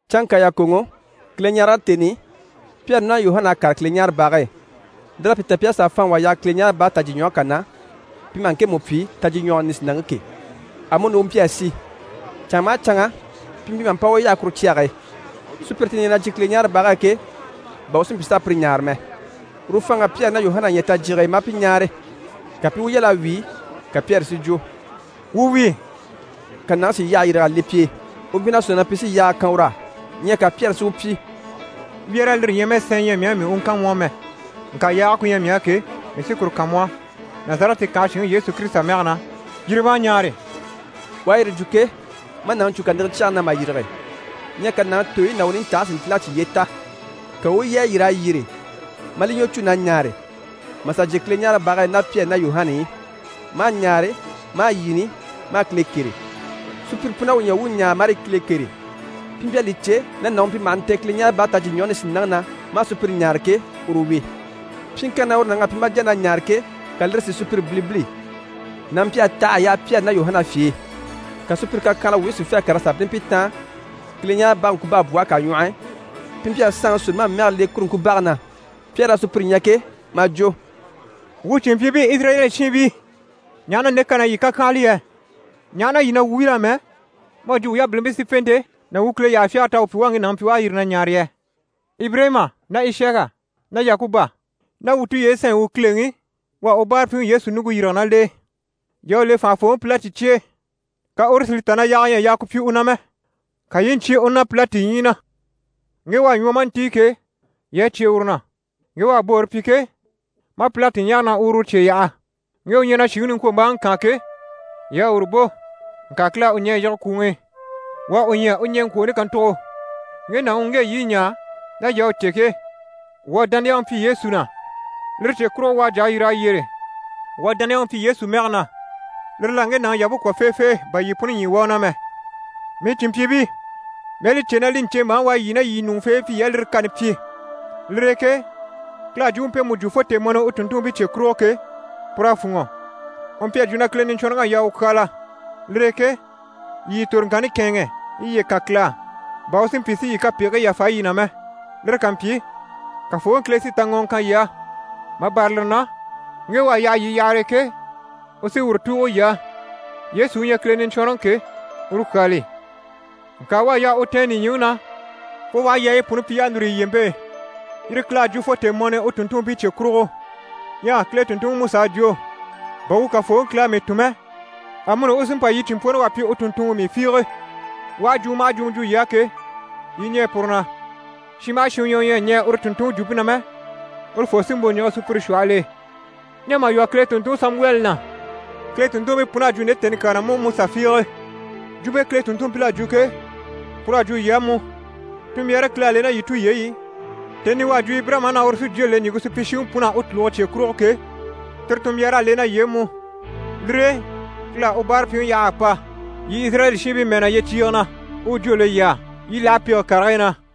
Canŋka yàkoŋɔ, Kileɲarege tèni i, Pyɛri ná Yuhana à kàre Kileɲaarebage e. Lir'à pi ta pi à sà faanŋi wà yaha Kileɲaarebage tajyiɲwɔge kà na, pi maha ŋkemu pyi: «Tajyiɲwɔge Nisinaŋke» ke. Amuni u mpyi a si. Canŋa maha canŋa, pi mpyi maha mpa u yaha kuru cyage e, sùpyire ti ɲyɛ na jyè Kileɲaarebage e ke, bà u si mpyi s'a pire ɲáare mɛ. Uru faanŋ'à Pyɛri ná Yuhana ɲya tajyige e maa pi ɲáare. Ka pi i u yal'a wíi, ka Pyɛri si jwo: «Wuu wíi.» Ka nàŋi si yyahe yîrig'a le pi e. U mpyi na sɔ̂nŋi na pi sí yaaga kan ur'á. Ɲyɛ ka Pyɛri si u pyi: «Wyɛ́rɛ, lire ɲyɛ mɛ sɛɛn ɲyɛ mii á mii u kan mu á mɛ, ŋka yaage ku ɲyɛ mii á ke, mii sí kuru kan mu á. Nazarɛti kànhe shinŋi Yesu Kirisita mɛge na, yîri ma a ɲaare!» U à yire jwo ke, maa nàŋi cû kàniŋɛ cyɛge na mà yîrige. Ɲyɛ ka nàŋi tooyi ná u nintajyiigii si ntíl'a cyiye ta. Ka u u yi a yîr'a yyére, maa li ɲwɔ cû na ɲaare, maa sà jyè Kileɲaarebage e ná Pyɛri ná Yuhana i, maa ɲaare, maa yini, maa Kile kêre. Sùpyire pun'à u ɲya u u ɲaare marii Kile kêre. Pi mpyi a li cè na nàŋi u mpyi maha ntɛ̀n Kileɲaarebage Tajyiɲwɔge Nisinaŋke na maa sùpyire ɲáare ke, uru wi. Pyiŋkanni na uru nàŋ'à pyi maa jà na ɲaare ke, ka lire si sùpyire bilibili. Nàŋi mpyi a taha a yaha Pyɛri ná Yuhana fye e. Ka sùpyire kàkyanhala wuubii si fê a kàr'a sà bínni pi taan, Kileɲaarebage ŋkubabwɔhe kà ɲwɔh'i, pi mpyi a Saanŋi Solomani mɛge le kuru ŋkubage na. Pyɛri à sùpyire ɲya ke, maa jwo: «Wuu cìnmpyiibii, Izirayɛli shiinbii, ɲaha na nde kan'à yii kàkyanhala yɛ? Ɲaha na yii na wuu wíl'amɛ mu à jwo wuu yabilimpii sífente ná wuu Kile yyahafyagare t'à wuu pyi wuu à ŋge nàŋi pyi u à yîri na ɲaare yɛ? Ibirayima ná Ishaka ná Yakuba ná wuu tulyeyi sanɲyi u Kileŋi, u à u báarapyiŋi Yesu ɲùŋke yîrige ná l'e. Yii à u le fànhafooŋi Pilati cye e, ka uru si li ta na yaaga ɲyɛ a yaa ku pyi u na mɛ, ka yii i ɲcyé u na Pilati ɲyii na. Ŋge u à ɲwɔ maa ntíi ke, yii à cyé uru na, ŋge u à boore pyi ke, maa Pilati ɲáare na u uru cye yaha. Ŋge u ɲyɛ na shìŋi niŋkwombaaŋi kaan ke, yii à uru bò, ŋka Kile à u ɲɛ̀ a yige kwùŋi i. Wuu à u ɲya u ɲɛŋkwooni kàntugo. Ŋge nàŋi u ŋge yii i ɲaa, ná yii à u cè ke, wuu à dániyaŋi pyi Yesu na, lire cye kurugo, u à jà a yîr'a yyére. Wuu à dániyaŋi pyi Yesu mɛge na, lire l'à ŋge nàŋi yampe kwɔ̀ feefee bà yii puni ɲyii wá u na mɛ. Mii cìnmpyiibii, mii à li cè na li ɲcèmbaaŋi u à yii ná yii ɲùŋufeebii pyi yii à lire kani pyi. Lire e ke Kile à jwumpe mpemu jwo fo tèemɔni i u tùnntunmpii cye kurugo ke, pur'à fûnŋɔ. U mpyi a jwo na Kile Niɲcwɔnrɔŋi à yaa u kyaala. Lire e ke yii yii toroŋkanni kɛ̂ɛnŋɛ, yii i yiye kan Kile á, bà u si mpyi si yii kapegigii yàfa yii na mɛ. Lire ká mpyi, Kafooŋi Kile sí taŋɔŋɔ kan yii á. Mà bâra lire na, ŋge u à yaha yii yahare e ke, u sí uru tùugo yii á, Yesu u ɲyɛ Kile Niɲcwɔnrɔŋi ke, uru kyaa li. Ŋka u à yaa u tɛ̀ɛn nìɲyiŋi na fo u aha yaayi puni pyi y'à núru yi lyempe e, yire Kile à jwo fo tèemɔni i u tùnntunmpii cye kurugo. Ɲyɛ Kile tùnntunŋiMusa à jwo “Bà wuu Kafooŋi Kile à mii tun mɛ, amuni u sí n‑pa yii cìnmpworoŋi wà pyi u tùnntunŋɔ mii fiige. U aha jwumɔ maha jwumɔ jwo yii á ke, yii i ɲɛɛ puru na. Shin maha shin u ɲyɛ u ɲyɛ a ɲɛɛ uru tùnntunŋi jwumpe na mɛ, urufoo sí n‑bò n‑yige sùpyire shwɔhɔl'e.” Ɲyɛ mà lwɔ́ Kile tùnntunŋi Samuwɛli na, Kile tùnntunmpii pun'à jwo nde tèni kyaa na mú, Musa fiige. Jwumpe Kile tùnntunmpil'à jwo ke, pur'à jwo yii á mú. Tunmbyaare Kile à le ná yii tulyeyi i, tèni i u à jwo Ibirayima á na uru sí jwó le ɲìŋke supyishiŋi pun'á u tùluge cye kurugo ke, tire tunmbyaar'à le ná yii e mú. Lire e Kile à u báarapyiŋi yaha a pa yii Izirayɛli shiinbii mɛɛ na yyecyiige na, u u jwó le yii á, yii i láha pege karigii na.»